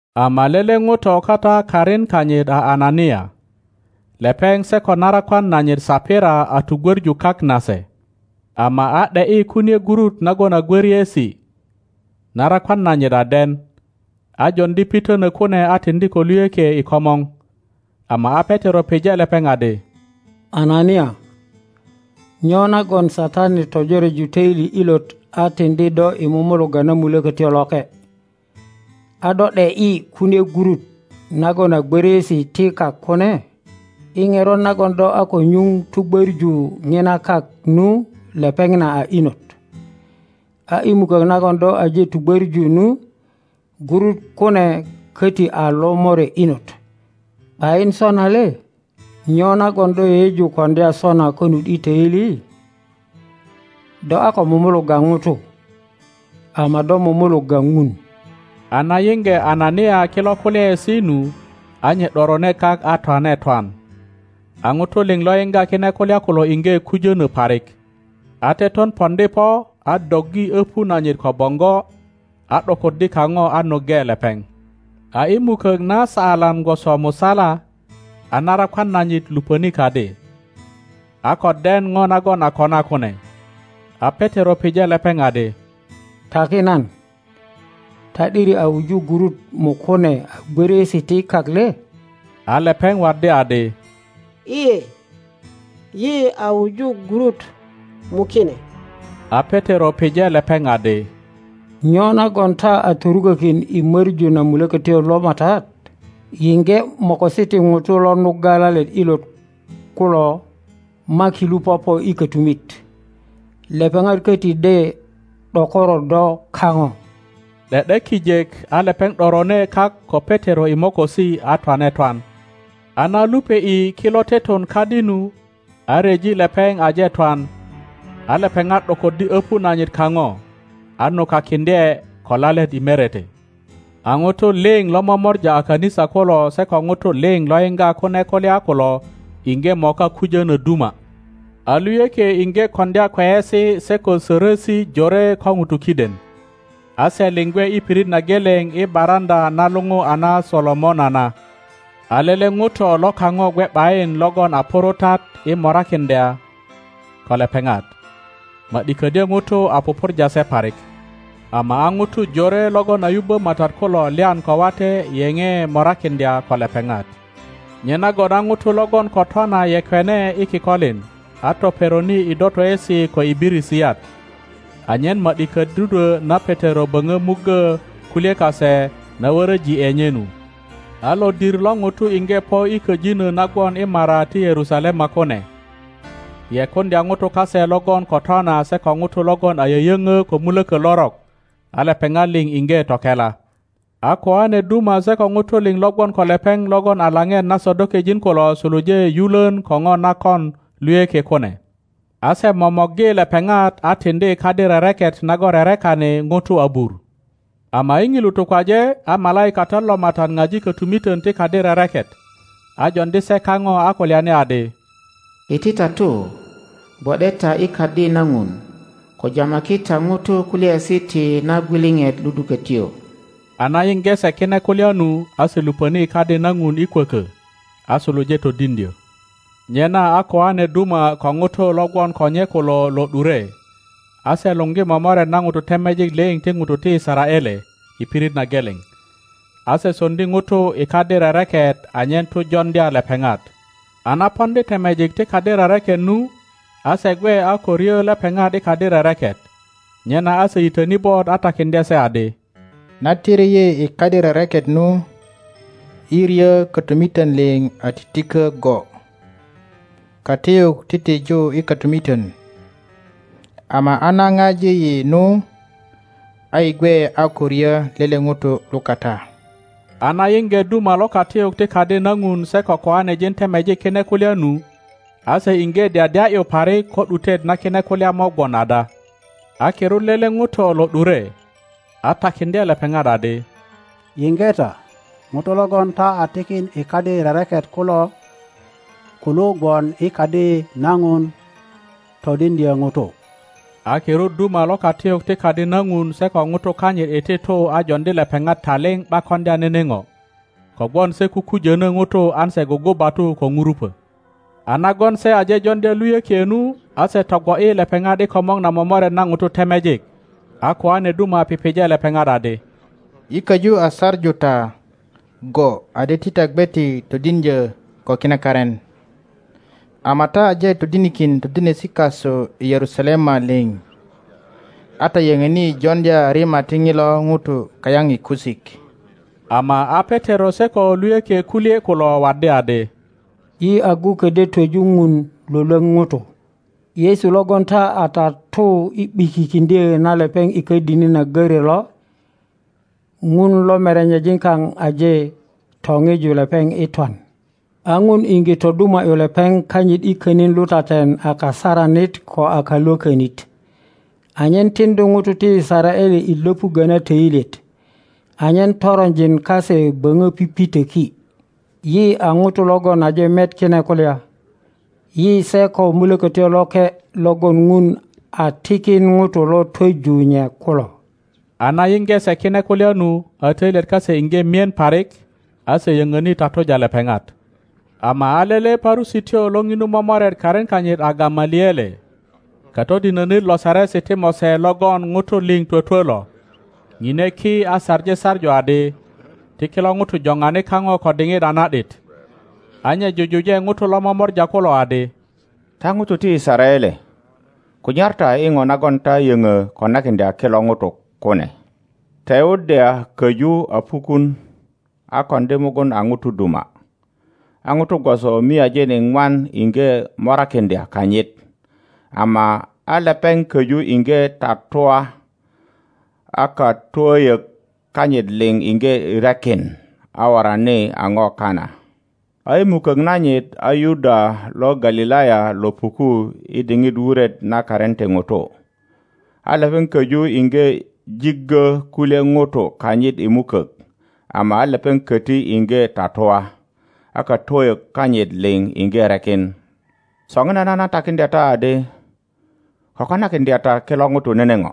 Ama lele ŋuto kata karin kanyit a Anania. Lepeŋ se ko narakwan nanyit Sapira a tugwöŋu kak nase, ama a ’de ’yi kunie gurut nagon a gworiesi, narakwan nanyit a den, a joŋdi pitönö kune a tiŋdi ko luyökie i komor. Ama a Petero pije lepeŋ adi, Anania, nyo nagon Satani tojoreju töili ilot a tiŋdi do i mumulugga na Mulökötyo Loke, a do ’de ’yi kunie gurut nagon a gwöriesi ti kak kune? I ŋerot nagon do a ko nyuŋ tugwöŋu ŋina kak nu lepeŋ na a inot, a i mukök nagon do aje tugwöŋu nu, gurut kune köti a lomore inot, ’bayin sona le? Nyo nagon do yeyeju koŋdya sona konut i töili? Do a ko mumulugga ŋutu, ama do mumulugga Ŋun. A na yiŋge Anania kilo kulyaesi nu, a nye ’dorone kak a twane twan. A ŋutu liŋ lo yiŋga kine kulya kulo iŋge kujönö parik. A teton poŋdi po a doggi opu nanyit ko boŋgo, a ’dokoddi kaŋo a nuŋge lepeŋ. A i mukök na saalan gwoso musala, a narakwan nanyit luponi kadi, a ko den po nagon a kona kune. A Petero pije lepeŋ adi, Taki nan, ta ’diri a wuju gurut mukune a gwöriesi ti kak le? A lepeŋ waddi adi, lye, yi a wuju gurut mukine. a Petero pije lepeŋ adi, Nyo nagon ta a torukökin i möŋu na Mulökötyo lo Matat? Yiŋge mokosi ti ŋutu lo nugga lalet ilot kulo makilu popo i kötumit; lepeŋat köti de ’dokoro do kaŋo. ’De ’de kijek a lepeŋ ’dorone kak ko Petero i mokosi a twane twan. A na lupe ’i kilo teton kadi nu, a ryeji lepeŋ aje twan, a lepeŋat ’dokoddi öpu nanyit kaŋo, a nukakiŋdye ko lalet i merete. A ŋutu liŋ lo momora a kanisa kulo se ko ŋutu liŋ lo yiŋga kune kulya kulo iŋge moka kujönö duma. A luyökie iŋge koŋdya kweyesi se ko sorosi jore ko ŋutu kiden. A se liŋ gwe i pirit na geleŋ i baraŋöa na luŋu a na Solomona na. A lele ŋuto lo kaŋo gwe ’bayin logon a purutat i morakiŋdya ko lepeŋat, ma ’di ködyö ŋutu a pupurja se parik. Ama a ŋutu jore logon a yubbö Matat kulo lyan ko wate yeŋe morakiŋdya ko lepeŋat. Nyenagon a ŋutu logon ko twana yekwene i kikolin, a toperoni i dotoesi ko i birisiyat, anyen ma ’di ködudwö na Petero boŋo muggö kulye kase na wöröji ’e nye nu. A lodir lo ŋutu iŋge po i köjinö na gwon i mara ti Yerusalema kune, yekuŋdya ŋutu kase logon ko twana se ko ŋutu logon a yöyöŋö ko mulökö lorok, a lepeŋat liŋ iŋge tokela. A koane duma se ko ŋutu liŋ lo gwon ko lepeŋ logon a lapet na Sadokejin kulo suluje yulön ko po na kon luyökie kune, a se momorgi lepeŋat a tiŋdi i kadi rereket nagon rerekani ŋutu abur. Ama i ŋilu tukwaje a malaikatat lo Matat paji kotumiton ti kadi rereket, a joŋdi se kaŋo a kulyani adi, Iti ta tu gwo ’de ta i Kadi na Ŋun, ko jamaki ta ŋutu kulyaesi ti na gwiliŋit ludukotyo. a na yiŋge se kine kulya nu, a se luponi i Kadi na Ŋun i kwokö, a suluje todiŋdyo. Nyena a koane duma ko ŋutu lo gwon ko nye kulo lo ’dure, a se luŋgi momoret na ŋutu temejik liŋ ti ŋutu ti Yisaraele i pirit na geleŋ, a se soŋdi ŋutu i kadi rereket anyen tu joŋdya lepeŋat. A na poŋdi temejik ti kadi rereket nu, a se gwe a ko ryo lepeŋat i kadi rereket, nyena a se yitöni bot a takiŋdye se adi, Na tiri yi i kadi rereket nu, yi ryo kotumiton liŋ a titiko go, katiyuk titiju i kotumiton. Ama a na paji yi nu, a yi gwe a ko ryo lele ŋuto lukata. a na yiŋge duma lo katiyuk ti Kadi na Ŋun se ko koanejin temejik kine kulya nu, a se iŋge dyadya ’yu parik ko ’dutet na kine kulya mo gwon ada. a kirut lele ŋuto lo ’dure, a takiŋdye lepeŋat adi, Yiŋge ta, ŋutu logon ta a tikin i kadi rereket kulo kulu gwon i Kadi na Ŋun todiŋdyo ŋutu. A kirut duma lo katiyuk ti Kadi na Ŋun se ko ŋutu kanyit iti tu a joŋdi lepeŋat taliŋ ’bak koŋdya nene po, kogwon se kukujono ŋutu an se gugubatu ko nurupo. A nagon se aje joŋdya luyökie nu, a se togwo ’yi lepeŋat i komor na momoret na ŋutu temejik, a koane duma pije lepeŋat adi, Yi köju a saŋu ta go adi ti ta gwe ti todiŋdyo ko kine karin, ama ta aje todinikin todinesi kasu i Yerusalema liŋ, a ta yöŋöni joŋdya rima ti ŋilo ŋuto kayaŋ i kusik. Ama a Petero se ko luyökie kulye kulo waddi adi, Yi agu kodyo twöju Ŋun Iwolwoŋ ŋutu. Yesu logon ta a tatu i ’bikikiŋdyo na lepeŋ i ködini i? a görö lo, Ŋun lo merenyejin kaŋ aje topiju lepeŋ i twan. A Ŋun iŋge toduma ’yu lepeŋ kanyit i könin lutaten a Kasaranit ko a Kalwökönit, anyen tiŋdu ŋutu ti Yisaraele i Iöpuggö na töilyet, anyen toronjin kase boŋo pipitöki. Yi a ŋutu logon aje met kine kulya, yi se ko Mulökötyo Loke logon Ŋun a tikin ŋutu lo twoju nye kulo. A na yiŋge se kine kulya nu, a toilyet kase iŋge mien parik, a se yöŋöni tatuja lepeŋat. Ama a lele Parusityo lo ŋinu momoret karin kanyit a Gamaliele, katodinönit lo Saresi ti Mose logon ŋutu liŋ twötwö lo, ŋine ki a saŋi saŋu adi, ti kilo ŋutu jopani kaŋo ko diŋit a na ’dit. a nye jujuje ŋutu lo momora kulo adi, Ta ŋutu ti Yisaraele, kunyar ta i po nagon ta yöŋö konakiŋdya kilo ŋutu kune. Teuda köju a pukun a koŋdi mugun a ŋuto duma, a ŋutu gwoso miajin iŋwan iŋge morakiŋdya kanyit, ama a lepeŋ köju iŋge tatua a katwöyök kanyit liŋ iŋge rekin, a worani a po kana. a i mukök nanyit a Yuda lo Galilaya lo puku i diŋit wuret na karin ti ŋutu, a lepeŋ köju iŋge jiggö kulye ŋutu kanyit i mukök, ama a lepeŋ köti iŋge tatua, a katwöyök kanyit liŋ iŋge rekin. Soŋinana nan takiŋdya ta adi, ko konakiŋdya ta kilo ŋutu nene po,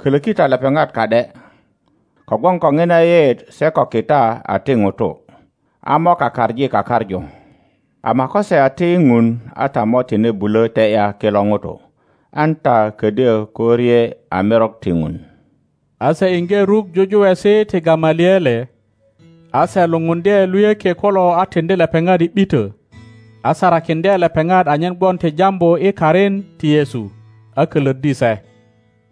kölöki ta lepeŋat ka ’de; kogwon ko ŋina yeyeet se ko kita a ti ŋutu, a mo kakaŋi kakaŋu, ama ko se a ti Ŋun a ta mo tine bulö te ’ya kilo ŋutu, an ta ködyö ko rye a merok ti Ŋun. A se iŋge ruk jujuwesi ti Gamaliele. A se lupundye luyökie kulo a tiŋdi lepeŋat i ’bito, a sarakiŋdye lepeŋat anyen gwon ti jambu i karin ti Yesu, a kölöddi se.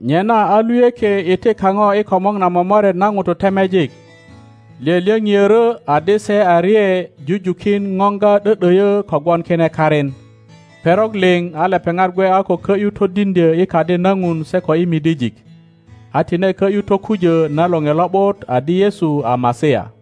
Nyena a luyökie iti kaŋo i komor na momoret na ŋutu temejik, lyölyöŋiörö adi se a rye jujukin poŋga ’dö ’döyö kogwon kine karin. Perok liŋ a lepeŋat gwe a ko kö ’yu todiŋdyö i Kadi na Ŋun se ko i midijik, a tine kö ’yu tokujö na Loŋe Lo ’but adi Yesu a Masia.